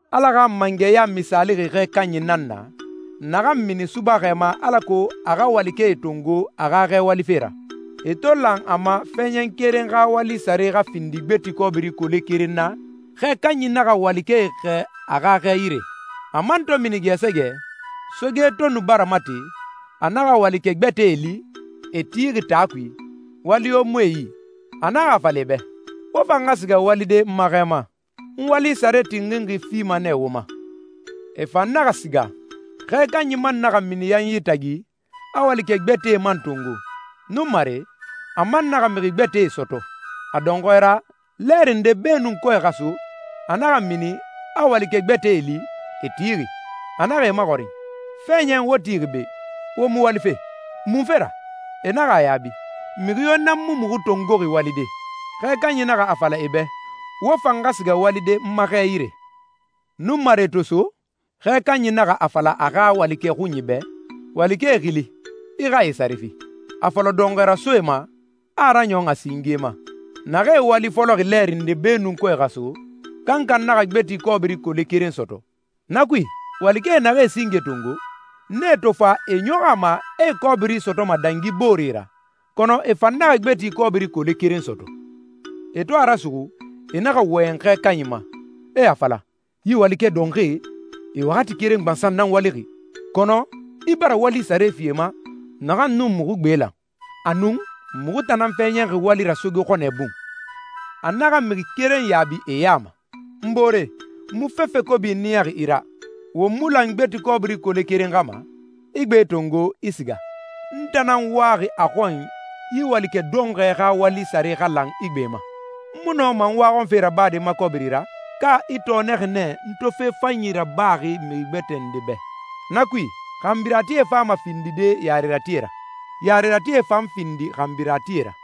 «Ala xa mangɛya misaalixi xɛ kanyi nan na, naxan mini subaxɛ ma alako a xa walikɛe tongo a xa xɛ walife ra. E to lan a ma fɛɛɲɛn keren xa wali sare xa findi gbeti kɔbiri kole keren na, xɛ kanyi naxa walikɛe xɛɛ a xa xɛ yire. A man to mini gɛɛsɛgɛ, soge to nu bara mate, a naxa walikɛ gbɛtɛe li, e tixi taa kui, wali yo mu e yi. A naxa a fala e bɛ, ‹Wo fan xa siga walide n ma xɛ ma. N wali sare tinxinxi fima nɛ wo ma.› E fan naxa siga. Xɛ kanyi man naxa mini yanyi tagi, a walikɛ gbɛtɛe man tongo. Nunmare, a man naxa mixi gbɛtɛe sɔtɔ. A dɔnxɔɛ ra, lɛɛri ndee beenu kɔɛ xa so, a naxa mini, a walikɛ gbɛtɛe li, e tixi. A naxa e maxɔrin, ‹Fɛɛɲɛn, wo tixi be, wo mu walife. Munfe ra?› E naxa a yaabi, ‹Mixi yo nan mu muxu tongoxi walide.› Xɛ kanyi naxa a fala e bɛ, ‹Wo fan xa siga walide n ma xɛ yire.›» «Nunmare to so, xɛ kanyi naxa a fala a xa walikɛ xunyi bɛ, ‹Walikɛe xili, i xa e sare fi. A fɔlɔ dɔnxɔɛ rasoe ma, a raɲɔn a singe ma.› Naxee wali fɔlɔxi lɛɛri ndee beenu kɔɛ xa so, kankan naxa gbeti kɔbiri kole keren sɔtɔ. Na kui, walikɛe naxee singe tongo, nee to fa e ɲɔxɔ a ma a e kɔbiri sɔtɔma dangi booree ra, kɔnɔ e fan naxa gbeti kɔbiri kole keren sɔtɔ. E to a rasuxu, e naxa wɔyɛn xɛ kanyi ma, e a fala, ‹Yi walikɛ dɔnxɔɛe, e waxati keren gbansan nan walixi, kɔnɔ i bara wali sare fi e ma naxan nun muxu gbe lan. Anun, muxu tan nan fɛɛɲɛnxi wali ra soge xɔnɛ bun!› A naxa mixi keren yaabi e ya ma, ‹N boore, n mu fefe kobi niyaxi i ra. Won mu lan gbeti kɔbiri kole keren xa ma? I gbe tongo, i siga. N tan nan waxi a xɔn yi walikɛ dɔnxɔɛ xa wali sare xa lan i gbe ma. N mu nɔma n waxɔnfe rabade n ma kɔbiri ra? Ka i tɔɔnɛxi nɛ n to fe fanyi rabaxi mixi gbɛtɛ nde bɛ?› Na kui, xanbiratie fama findide yareratie ra, yareratie fan findi xanbiratie ra.»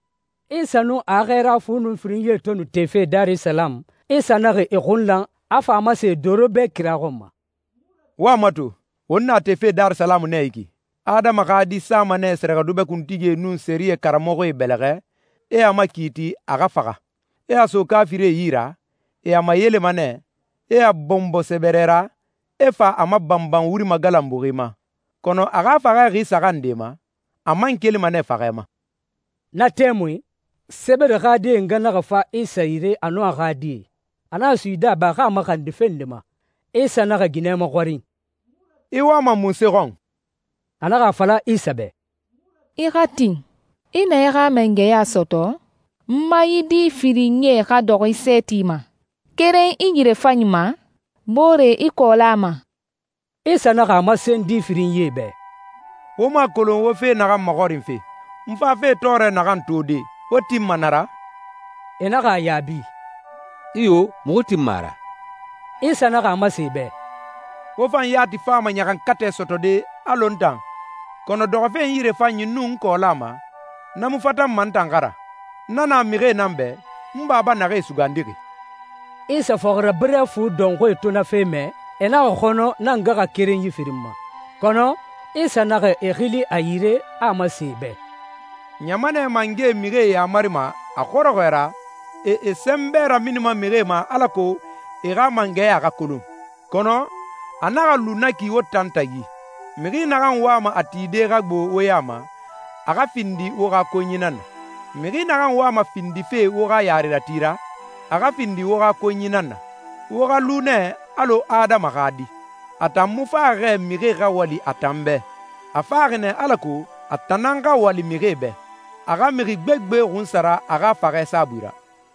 Isa nun a xɛɛra fu nun firinyie to nu tefe Darisalamu, Isa naxa e xun lan, a fa a masen e doro bɛ kira xɔn ma, «Wo a mato, won na tefe Darisalamu nɛ yi ki. Adama xa Di sama nɛ sɛrɛxɛdubɛ kuntigie nun sɛriyɛ karamɔxɔe bɛlɛxɛ, e a makiiti a xa faxa, e a so kaafirie yi ra. E a mayelema nɛ, e a bɔnbɔ sɛbɛrɛ ra, e fa a mabanban wuri magalanbuxi ma, kɔnɔ a xa faxɛ xi saxan nde ma, a man kelima nɛ faxɛ ma.» Na tɛmui Sebede xa die nga naxa fa Isa yire, a nun a xa die. A naxa suyidi a bɛ, a xa a maxandi fe nde ma. Isa naxa ginɛ maxɔrin, «I wama munse xɔn?» A naxa a fala Isa bɛ, «I xa tin, i na i xa mangɛya sɔtɔ, n ma yi di firinyie xa dɔxɔ i sɛɛti ma, keren i yirefanyi ma, boore i kɔɔla ma.» Isa naxa a masen di firinyie bɛ, «Wo mu a kolon wo fe naxan maxɔrinfe. N fafe tɔɔrɛ naxan tode, wo tinma na ra?» E naxa a yaabi, «Iyo, muxu tinma a ra.» Isa naxa a masen e bɛ, «Wo fan yati fama ɲaxankatɛ sɔtɔde alɔ n tan, kɔnɔ dɔxɔfe n yirefanyi nun n kɔɔla ma, na mu fatanma n tan xa ra. Na na mixie nan bɛ, n Baba naxee sugandixi.» Isa fɔxirabirɛ fu dɔnxɔɛe to na fe mɛ, e naxa xɔnɔ na ngaxakerenyi firin ma. Kɔnɔ Isa naxa e xili a yire, a a masen e bɛ, «Ɲamanɛ mangɛe mixie yamarima a xɔrɔxɔɛ ra, e e sɛnbɛ raminima mixie ma alako e xa mangɛya xa kolon. Kɔnɔ a naxa lu na ki wo tan tagi. Mixi naxan wama a tide xa gbo wo ya ma, a xa findi wo xa konyi nan na. Mixi naxan wama findife wo xa yarerati ra, a xa findi wo xa konyi nan na. Wo xa lu nɛ alɔ Adama xa Di. A tan mu faxi xɛ mixie xa wali a tan bɛ. A faxi nɛ alako a tan nan xa wali mixie bɛ, a xa mixi gbegbe xunsara a xa faxɛ saabui ra.»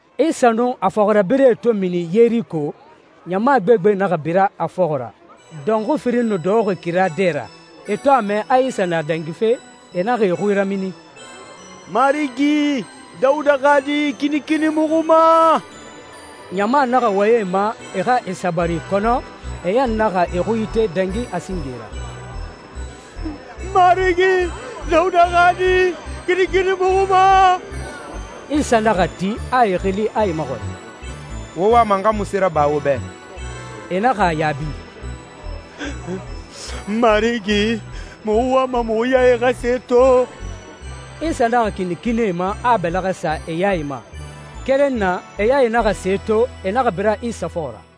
Isa nun a fɔxirabirɛe to mini Yeriko, ɲama gbegbe naxa bira a fɔxɔ ra. Dɔnxui firin nu dɔxɔxi kira dɛ ra. E to a mɛ a Isa na dangife, e naxa e xui ramini, «Marigi, Dawuda xa Di, kinikini muxu ma!» Ɲama naxa wɔyɛn e ma, e xa e sabari, kɔnɔ e ɲan naxa e xui ite dangi a singe ra, «Marigi, Dawuda xa Di, kinikini muxu ma!» Isa naxa ti, a e xili, a e maxɔrin, «Wo wama n xa munse raba wo bɛ?» E naxa a yaabi, «Marigi, muxu wama muxu yae xa se to.» Isa naxa kinikini e ma, a a bɛlɛxɛ sa e yae ma. Keren na, e yae naxa se to, e naxa bira Isa fɔxɔ ra.